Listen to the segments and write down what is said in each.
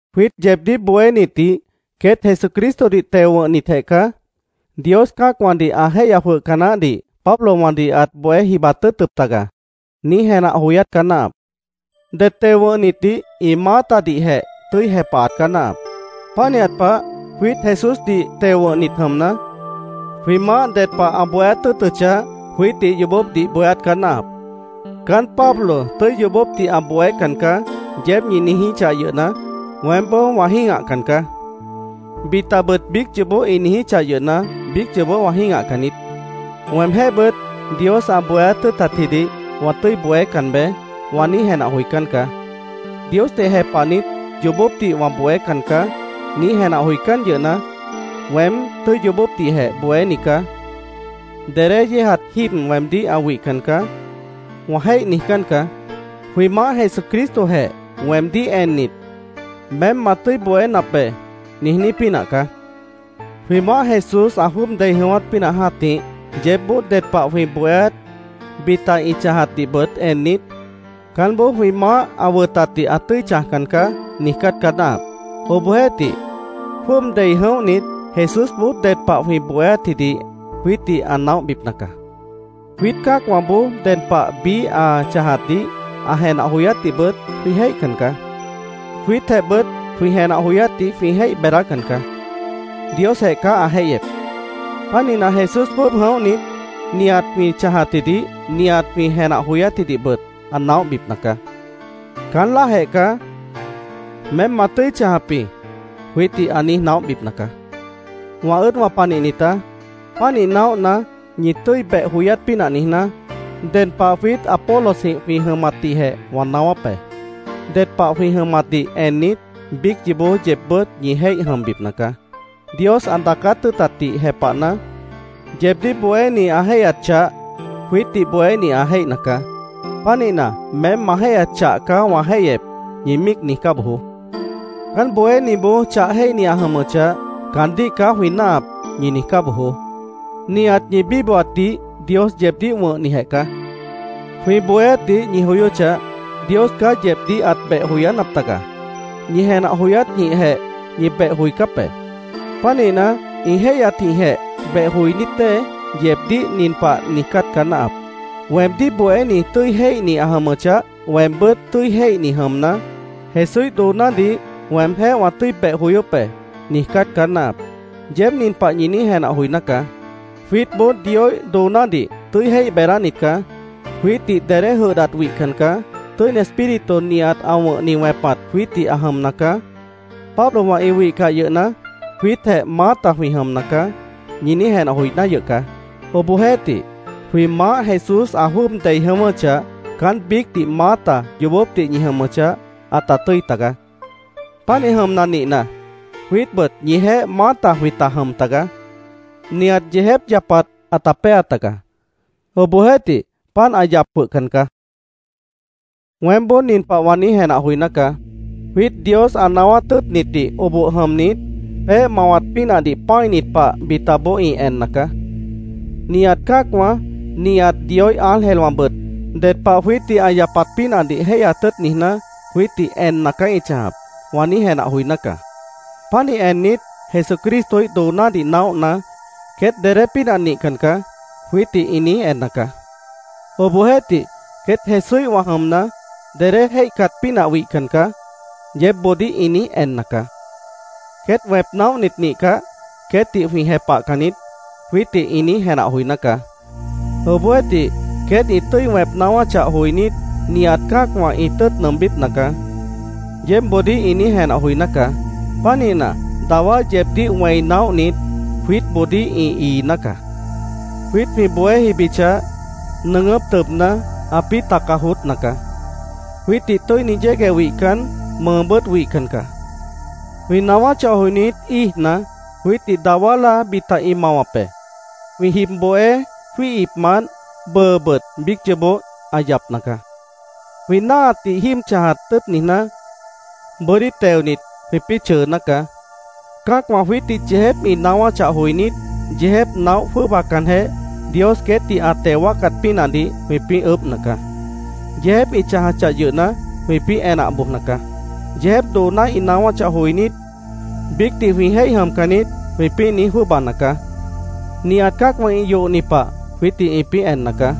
Jwiít yeebdíh bohénitdih “Queét Jesucristodih teo wʉ̃hnitjeh caá. Dios cã́acwãdih ã jéihya jwʉhca naáhdih Pablowãdih ãt bohé jibat tʉ́ʉtʉp taga”, niíj jenah joyát caá náahap. Det teo wʉ̃hnitdih ĩ maátadihjeh tʉ́i jepahat caá náahap. Pánihat pah, jwiít Jesúsdih teo wʉ̃hnit jʉmna, jwĩ Maáh ded pah ã bohéát tʉ́ʉtʉchah, jwiítdih yoobópdih bohéát caá náahap. “Caán Pablo tʉ́i yoobópdih ã bohécan caá”, yeéb ñi niijíchah yʉhna, weémboó wã jĩ́gahcan caá. Bitabʉt biíc yoobó ĩ niijíchah yʉhna, biíc yoobó wã jĩ́gahcan niít. Weemjéhbʉt “Dios ã bohéát tʉ́ʉtatjidih wã tʉ́i bohécan beé”, wã niíj jenah joicán caá. “Diosdih jepahnit, yoobópdih wã bohécan caá”, niíj jenah joicán yʉhna, “Weém tʉ́i yoobópdihjeh bohéni caá. Dedé yéejat jíib weemdíh ã wihcan caá”, wã jéih niijcán caá. Jwĩ Maáh Jesucristojeh weemdíh ennit, “Meém ma tʉ́i bohénap be”, niijní pínah caá. Jwĩ Maáh Jesús ã jwʉ́ʉb dei jʉ̃ʉ́wát pínah jã́tih, yeébboó ded pah jwĩ bohéát, bita ĩ chãjatdihbʉt ennit, “Caánboó jwĩ Maáh ã wʉtatdih ã tʉ́i chãjcan caá”, niijcát caá náahap. Obohjeéhtih, jwʉ́ʉb dei jʉ̃óhnit, Jesúsboó ded pah jwĩ bohéátjidih jwiítdih ã naóhbipna caá. Jwiít cã́acwãboó ded pah biíh ã chãjatdih, ã jenah joyátdihbʉt jwĩ jéihcan caá. Jwiítjehbʉt jwĩ jenah joyátdih jwĩ jéih beedácan caá. Diosjeh caá ã jéihyep. Pánihna, Jesús jwʉ́ʉb jʉ̃óhnit, nihat jwĩ chãjatjidih, nihat jwĩ jenah joyátjidihbʉt ã naóhbipna caá. Caán láajeh caá “Meém ma tʉ́i chãjap jĩ”, jwiítdih ã niíj naóhbipna caá. Wã ʉ́ʉdwã panihnitá, pánih naóhna, ñi tʉ́i beh joyát pínah niijná, ded pah jwiít Apolosjĩh jwĩ jʉmatdihjeh wã naáwáp be. Ded pah jwĩ jʉmatdih ennit, biíc yoobó yeebbʉ́t ñi jéih jʉmbipna caá. Dios ã daacát tʉ́ʉtatdih jepahna, “Yeebdíh bohéni ã jéihyat chah jwiítdih bohéni ã jéihna caá. Pánihna, meém ma jéihyat chah caá wã jéihyep”, ñi míic niijcá bojoó “Caán bohéniboó chah jéihni ã jʉmʉchah, caandíh caá jwĩ náahap”, ñi niijcá bojoó. Nihat ñi bíbohatdih Dios yeebdíh wʉ̃hnijeh caá. Jwĩ bohéátdih ñi joyóchah, Dios caá yeebdíh ãt beh joyánap taga. Ñi jenah joyátjĩhjeh ñi beh joicáp be. Pánihna, ĩ jéihyatjĩhjeh beh joinít dée, yeebdíh nin pah niijcát caá náahap: “Weemdíh bohéni tʉ́i jéihni ã jʉmʉchah, weembʉ́t tʉ́i jéihni jʉmna, Jesúíh doonádih weemjéh wã tʉ́i beh joyóp be”, niijcát caá náahap. Yeéb nin pah ñi niíj jenah joiná caá. “Jwiítboó Dioíh doonádih tʉ́i jéih beedánit caá. Jwiítdih dedé jʉdhdat wihcan caá. Tʉ́ini Espíritu nihat ã wʉ̃hni wẽpat jwiítdih ã jʉmna caá. Pablowã ĩ wihcah yʉhna, jwiítjeh maáta jwĩ jʉmna caá”, ñi niíj jenah joiná yʉh caá. Obohjeéhtih, jwĩ Maáh Jesús ã jwʉ́ʉb dei jʉ̃ʉ́wʉ́chah, caán biícdih maáta yoobópdih ñi jʉmʉchah, ãta tʉ́i taga. Pánih jʉmna nihna, jwiítbʉt ñijeéh maáta jwĩta jʉm taga. Nihat yeejép yapat ãta péa taga. Obohjeéhtih, páant ã yap jwʉhcan caá. Weémboó nin pah wã niíj jenah joiná caá: “Jwiít Dios ã naáwát tʉ́ʉtnitdih oboh jʉmnit, peéh mawat pínahdih pã́init pah bitaboó ĩ enna caá. Nihat cã́acwã, nihat Dioíh ángelwãbʉt ded pah jwiítdih ã yapat pínahdih jéihyat tʉ́ʉt niijná, jwiítdih enna caá ĩ chãjap”, wã niíj jenah joiná caá. Pánih ennit, “Jesucristoíh doonádih naóhna, queét dedé pínah nihcan caá”, jwiítdih ĩ niíj enna caá. Obohjeéhtih, “Queét Jesúíhwã jʉmna, dedé jéihcat pínah wihcan caá”, yeébboodíh ĩ niíj enna caá. “Queét wẽp naóhnit nihcah, queétdih jwĩ jepahcan niít”, jwiítdih ĩ niíj jenah joiná caá. Obohjeéhtih, “Queét ĩ tʉ́i wẽp naáwáchah joinít, nihat cã́acwã ĩ tʉ́ʉt nʉʉmbípna caá”, yeébboodíh ĩ niíj jenah joiná caá. Pánihna, dawá yeebdíh wẽi naóhnit, jwiítboodíh ĩ iiná caá. Jwiít jwĩ bohé jibichah, nʉʉgʉ́p tʉbna, ãpĩ́ taca joótna caá. Jwiítdih tʉ́ini yégueh wihcan, mʉʉbʉ́t wihcan caá. Jwĩ naáwáchah joinít, íijna, jwiítdih dawá láa bita ĩ mawap be. Jwĩ jib bohé jwíihipmant, bʉʉbʉt biíc yoobó ã yapna caá. Jwĩ náahatdih jíib chãjat tʉ́ʉt niijná, bʉ́dí teonit, jwĩpĩ́ chʉʉná caá. Cã́acwã jwiítdih yeejép ĩ naáwáchah joinít, yeejép naóh jwʉ́ʉbacanjeh, Dios queétdih ã teo wáacat pínahdih jwĩpĩ́ ʉʉ́bhna caá. Yeejép ĩ chãjachah yʉhna, jwĩpĩ́ enah bojna caá. Yeejép dooná ĩ naáwáchah joinít, “¿Biícdih jwĩ jéih jʉmcan niít?” jwĩpĩ́ niíj jwʉ́ʉbana caá. Nihat cã́acwã ĩ yohni pah jwiítdih ĩpĩ́ enna caá.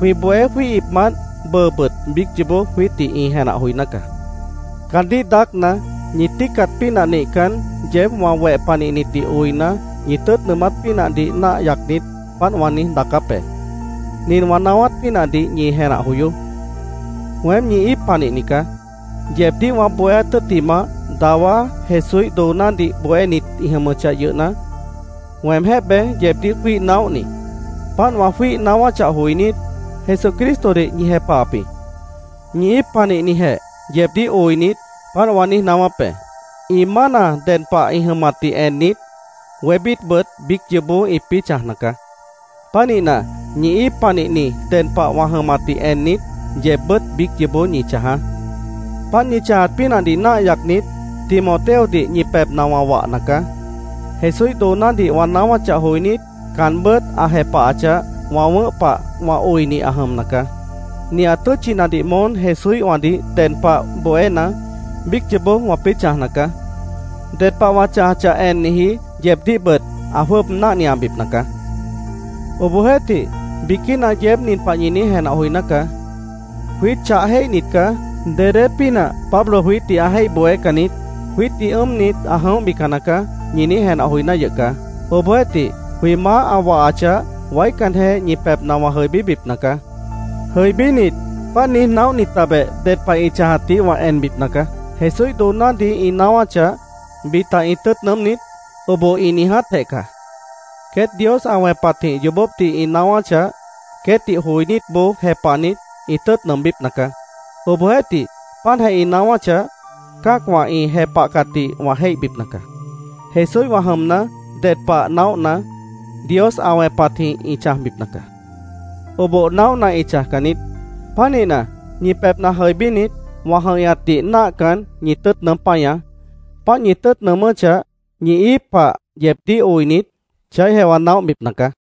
Jwĩ bohé jwíihipmant bʉʉbʉt biíc yoobó jwiítdih ĩ jenah joiná caá. Caandíh daácna, ñi tíicat pínah nihcan, yeéb wã weh panihnitdih oina, ñi tʉ́ʉt nʉʉmát pínahdih náah yacnit, páant wã niíj daacáp be. Nin wã naáwát pínahdih ñi jenah joyoó: Weém ñi íip panihni caá. Yeebdíh wã bohéát tʉ́ttimah, dawá Jesúíh doonádih bohénit ĩ jʉmʉchah yʉhna, weemjéh beé yeebdíh jwíih naóhni. Páant wã jwíih naáwáchah joinít, Jesucristodih ñi jepahap jĩ. Ñi íip panihnijeh yeebdíh oinit, páant wã niíj naáwáp be. Ĩ mána ded pah ĩ jʉmatdih ennit, wébítbʉt biíc yoobó ĩpĩ́ chãjna caá. Pánihna, ñi íip panihni ded pah wã jʉmatdih ennit, yeebbʉ́t biíc yoobó ñi chãjaá. Páant ñi chãjat pínahdih náah yacnit, Timoteodih ñi pebhna wã wahna caá. Jesúíh doonádih wã naáwáchah joinít, caanbʉ́t ã jepahachah, wã wʉ̃ʉ́h pah wã oini ã jʉmna caá. Nihat tʉ́tchinadih moón Jesúíhwãdih ded pah bohéna, biíc yoobó wãpĩ́ chãjna caá. Ded pah wã chãjachah enniji yeebdíhbʉt ã jwʉ́ʉb náhniabipna caá. Obohjeéhtih, biquína yeéb nin pah ñi niíj jenah joiná caá: “Jwiít chah jéihnit caá. Dedé pínah Pablo jwiítdih ã jéih bohécan niít. Jwiítdih ʉ́ʉmnit, ã jʉ̃óhbican nacaá”, ñi niíj jenah joiná yʉh caá. Obohjeéhtih, jwĩ Maáh ã wahachah, waícanjeh ñi pebhna wã jʉibíbipna caá. Jʉibínit, páant niíj naóhnitabeh ded pah ĩ chãjatdih wã enbipna caá. Jesúíh doonádih ĩ naáwáchah, ¿Bita ĩ tʉ́ʉt nʉʉ́m niít? ¿Oboh ĩ niijátjeh caá? Queét Dios ã wẽpatjĩh yoobópdih ĩ naáwáchah, queétdih joinítboó jepahnit, ĩ tʉ́ʉt nʉʉmbípna caá. Obohjeéhtih, páantjeh ĩ naáwáchah, cã́acwã ĩ jepahcatdih wã jéihbipna caá. Jesúíhwã jʉmna, ded pah naóhna, Dios ã wẽpatjĩh ĩ chãjbipna caá. Oboh naóhna, ĩ chãjcan niít. Pánihna, ñi pebhna jʉibínit, wã jʉ̃ihñatdih náahcan, ñi tʉ́ʉt nʉʉ́m páñaá. Páant ñi tʉ́ʉt nʉʉmʉ́chah, ñi íip pah yeebdíh oinit, chaíhjeh wã naóhbipna caá.